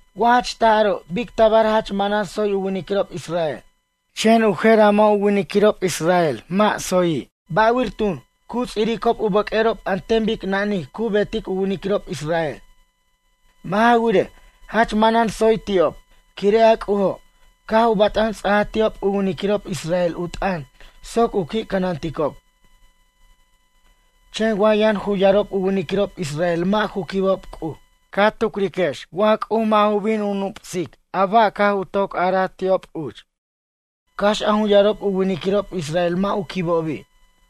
Wa jach taj aro', bic tabar jach manan tsoy u winiquirob israel, chen u jer a mʌ' ju winiquirob israel mʌ' tsoyi'? Ba'wir tun, cu ts'iricob u bʌq'uerob an ten bic nanij cu beticob u winiquirob israel? Mʌ' ja wirej, jach manan tsoy ti'ob. Quire' a C'ujo', caj u bat'an ts'aja ti'ob u winiquirob israel u t'ʌn soc u qui' cʌnanticob. Chen wa yʌn jun yarob u winiquirob israel mʌ' ju quibob C'uj, ca tucriquex wa C'uj mʌ' ju bin u nup'sic a ba' caj u toc araj ti'ob uch, cax a jun yarob u winiquirob israel mʌ' u quibobi'?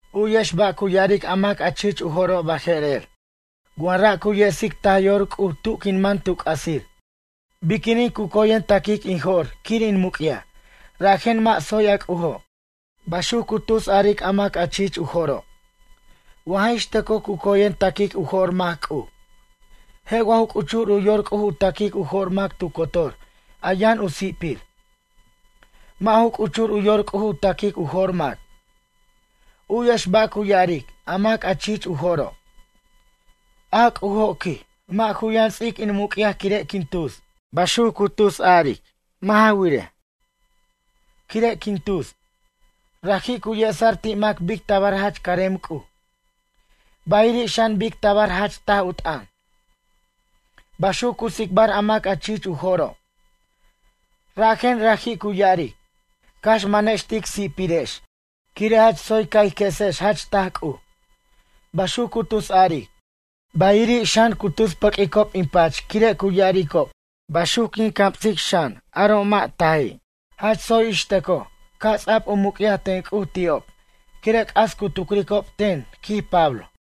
U'yex ba' cu ya'aric a mac chich u jo'ro' baje'rer: “Wa ra' cu yesic taj yor C'uj, tu quin man tu c'asir biquinin cu coyen taquic in jo'r quir in muc'yaj, rajen mʌ' tsoy a C'ujo'”, baxuc cu tus a'aric a mac chich u jo'ro'. Wa jix tʌcoj cu coyen taquic u jo'r mac C'uj. Je' wa ju c'uchur u yor C'uj u ta'quic u jo'r mac tu cotor a yʌn u si'pir? Mʌ' ju c'uchur u yor C'uj u ta'quic u jo'r mac. U'yex ba' cu ya'aric a mac a chich u jo'ro': “A C'ujo', quij, mʌ' ju yʌn ts'ic in muc'yaj quire' quin tus. Baxuc cu tus aric mʌ' ja wirej, quire' quin tus, raji' cu yesa'r ti' mac bic tabar jach carem C'uj, bayiri' xan, bic tabar jach taj u t'ʌn”, baxuc cu tsicbar a mac a chich u jo'ro'. Rajen, raji' cu ya'aric: “Cax manex tic si'pirex, quire' jach tsoy ca' ij quesex jach taj C'uj”, baxuc cu tus a'aric. Bayiri' xan, cu tus pʌq'uicob in pach quire' cu ya'aricob baxuc quin camsic xan, aro' mʌ' taji'. Jach tsoy, ix tʌcoj ca' ts'abʌc u muc'yaj ten C'uj ti'ob, quire' c'as cu tucricob ten, quij Pablo.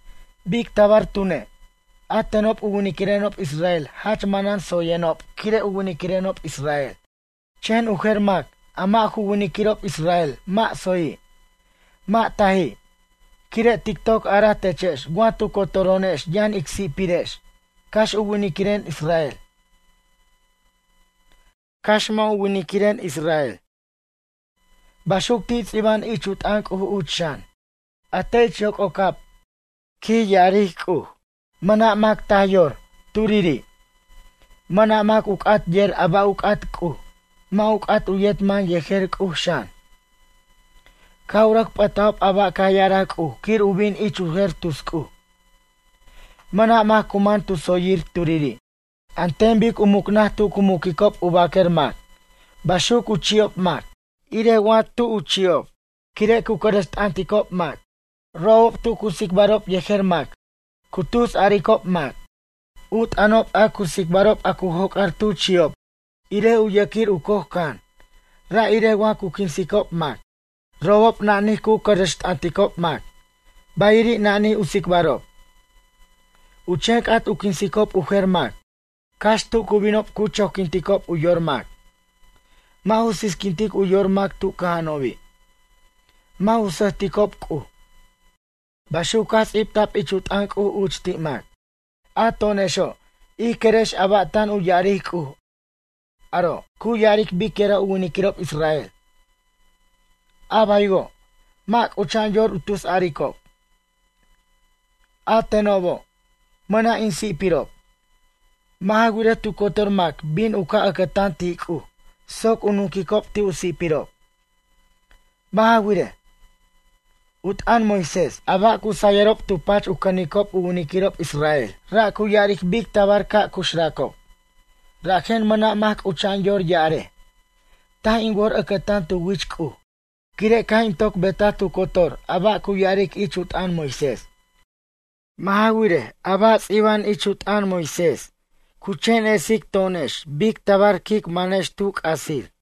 Bic tabar tune', a tenob u winiquirenob israel jach manan tsoyenob quire' u winiquirenob israel, chen u jer mac, a mʌ' ju winiquirob israel, mʌ' tsoyi'. Mʌ' taji', quire' tic toc araj techex wa tu cotoro'onex yʌn ic si'pirex, cax u winiquiren israel, cax mʌ' ju winiquiren israel. Baxuc ti' ts'iba'an ich u t'ʌn C'uj uch xan: A te' ich yoc'ocab, quij ya'ar C'uj, mʌna' mac taj yor, turiri'. Mʌna' mac u c'at yer a ba' u c'at C'uj, mʌ' u c'at u yet man yejer C'uj xan. Caj u rʌc p'ʌtob a ba' caj ya'araj C'uj quir u bin ich u jer tus c'uj. Mʌna' mac cu man tu tsoyir, turiri'. An ten bic u mucnʌj tu cu muquicob u baquer mac, baxuc u chi'ob mac, irej wa tu' u chi'ob, quire' cu cʌrʌxt'ʌnticob mac. Robob tu cu tsicbarob yejer mac, cu tusaricob mac. U t'ʌnob a cu tsicbarob a cu joc'ar tu chi'ob, irej u yʌquir u coj can, ra' irej wa cu quinsicob mac. Robob nanij cu cʌrʌxt'ʌnticob mac, bayiri', nanij u ts'ictarob. U chen c'at u quinsicob u jer mac. Cax tu cu binob cu choquinticob u yor mac. Mʌ' ju sisquinticob u yorob mac tu cʌja'anobi'. Mʌ' ju sʌjticob C'uj. Baxuc caj ts'ibta'b ich u t'ʌn C'uj uch ti' mac. A to'onexo', ij querex a ba' tan tu ya'aric C'uj, aro' cu ya'aric biquira' u winiquirob israel. A baywo', mʌ' c'ucha'an yor u tusaricob: “A tenobo', mʌna' in si'pirob.” Mʌ' ja wirej tu cotor mac bin u ca' ʌcʌtan ti' C'uj, soc u nunquicob ti' u si'pirob. Mʌ' ja wirej, u t'ʌn Moisés, a ba' cu sayʌrob tu pachob u cʌnicob u winiquirob israel. Ra' cu ya'aric bic tabar ca' cuxracob. Rajen mʌna' mac c'ucha'an yor ya'arej: “Taj in wor ʌcʌtan tu wich C'uj, quire' caj in toc betaj tu cotor a ba' cu ya'aric ich u t'ʌn Moisés.” Mʌ' ja wirej, a ba' ts'iba'an ich u t'ʌn Moisés cu chen esic to'onex bic tabar quic manex tu c'asir.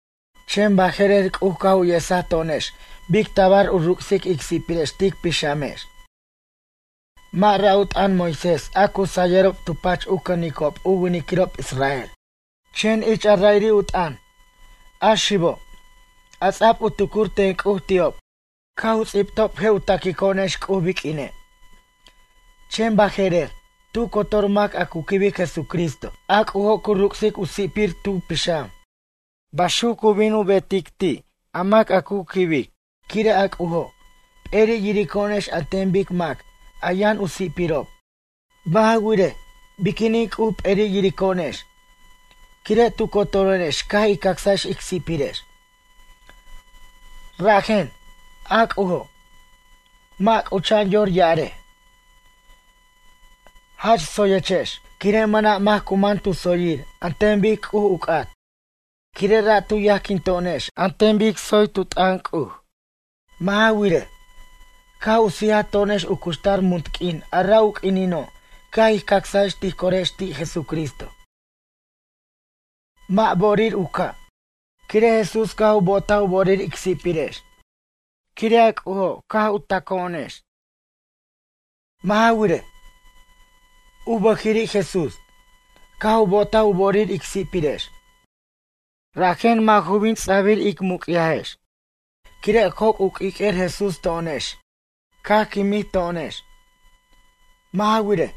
Chen baje'rer C'uj caj u yesaj to'onex bic tabar u ruc'sic ic si'pirex tic pixamex. Mʌ' ra' u t'ʌn Moisés a cu sayʌrob tu pach u cʌnicob u winiquirob israel. Chen ich a ra'iri' u t'ʌn, a xibo', a ts'a'b u tucur ten C'uj ti'ob caj u ts'ibtob je' u taquico'onex C'uj biq'uine'. Chen baje'rer, tu cotor mac a cu quibic Jesucristo, a C'ujo' cu ruc'sic u si'pir tu pixam. Baxuc cu bin u betic ti' a mac a cu quibic, quire' a C'ujo', p'eri' yirico'onex an ten bic mac a yʌn u si'pirob. Mʌ' ja wirej, biquinin C'uj p'eri' yirico'onex? Quire' tu cotoro'onex caj ij cacsex ic si'pirex. Rajen, a C'ujo', mʌ' c'ucha'an yor ya'arej: “Jach tsoyechex”, quire' mʌna' mac cu man tu tsoyir an ten bic C'uj u c'at. Quire' ra' tu yajquin to'onex an ten bic tsoy tu t'ʌn C'uj. Mʌ' ja wirej, caj u sija to'onex u cuxtar munt q'uin a ra' u q'uinino' caj ij cacsaj tij corex ti' Jesucristo. Mʌ' bo'orir u ca', quire' Jesús caj u bo'otaj u bo'orir ic si'pirex. Quire' a C'ujo' caj u taco'onex. Mʌ' ja wirej, u bʌjiri' Jesús, caj u bo'otaj u bo'orir ic si'pirex. Rajen mʌ' ju bin ts'abir ic muc'yajex quire' joc' u q'uiq'uer Jesús to'onex, caj quimij to'onex. Mʌ' ja wirej,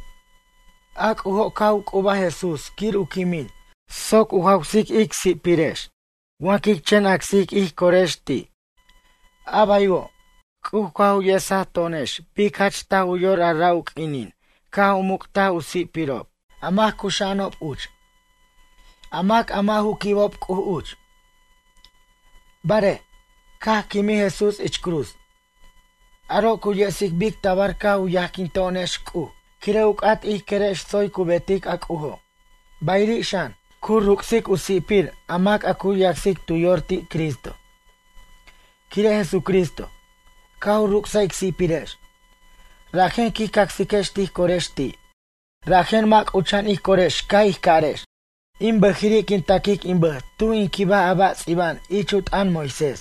a C'ujo' caj u c'ubaj Jesús quir u quimin soc u jawsic ic si'pirex wa quic chen acsic ij corex ti'. A baywo', C'uj caj u yesaj to'onex bic jach taj u yor a ra' u q'uinin caj u muc'taj u si'pirob a mac cuxa'anob uch, a mac a mʌ' ju quibob C'uj uch. Barej, caj quimij Jesús ich cruz, aro' cu yesic bic tabar caj u yajquin to'onex C'uj, quire' u c'at ij querex tsoy cu betic a C'ujo', bayiri' xan, cu ruc'sic u si'pir a mac a cu yacsic tu yor ti' Cristo. Quire' Jesucristo, caj u ruc'saj ic si'pirex, rajen quij cacsiquex tij corex ti'. Rajen mʌ' c'ucha'an ij corex ca' ij carex: “In bʌjiri' quin taquic in bʌj tuj in quibaj a ba' ts'iba'an ich u t'ʌn Moisés.”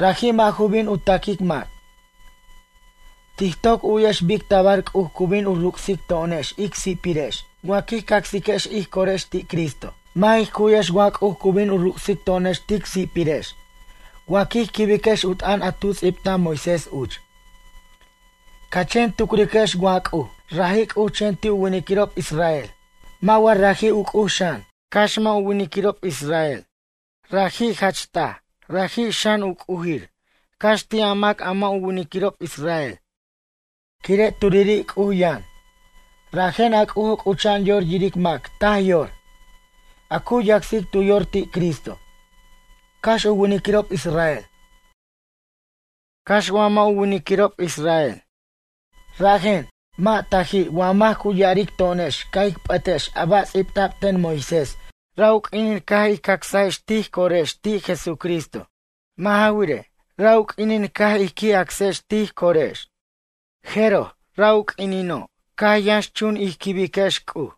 Raji' mʌ' ju bin u taquic mac. Tij toc u'yex bic tabar C'uj cu bin u ruc'sic to'onex ic si'pirex, wa quij cacsiquex ij corex ti' Cristo. Mʌ' jij cu'yex wa C'uj cu bin u ruc'sic to'onex tic si'pirex, wa quij quibiquex u t'ʌn a tu ts'ibtaj Moisés uch. Ca chen tucriquex wa C'uj, raji' C'uj chen ti' u winiquirob israel? Mʌ' wa raji' u C'uj xan, cax mʌ' ju winiquirob israel? Raji' jach taj, raji' xan, u C'ujir, cax ti' a mac a mʌ' ju winiquirob israel. Quire' turiri' C'uj yʌn, rajen a C'ujo' c'ucha'an yor yiric mac taj yor, a cu yacsic tu yor ti' Cristo, cax u winiquirob israel, cax wa mʌ' ju winiquirob israel. Rajen, mʌ' taji' wa mac cu ya'aric to'onex caj ic p'ʌtex a ba' ts'ibta'b ten Moisés ra' u q'uinin caj ij cacsajex ij corex ti' Jesucristo. Mʌ' ja wirej, ra' u q'uinin caj ij qui' acsex ij corex, jeroj ra' u q'uinino' caj yʌnxchun ij quibiquex C'uj.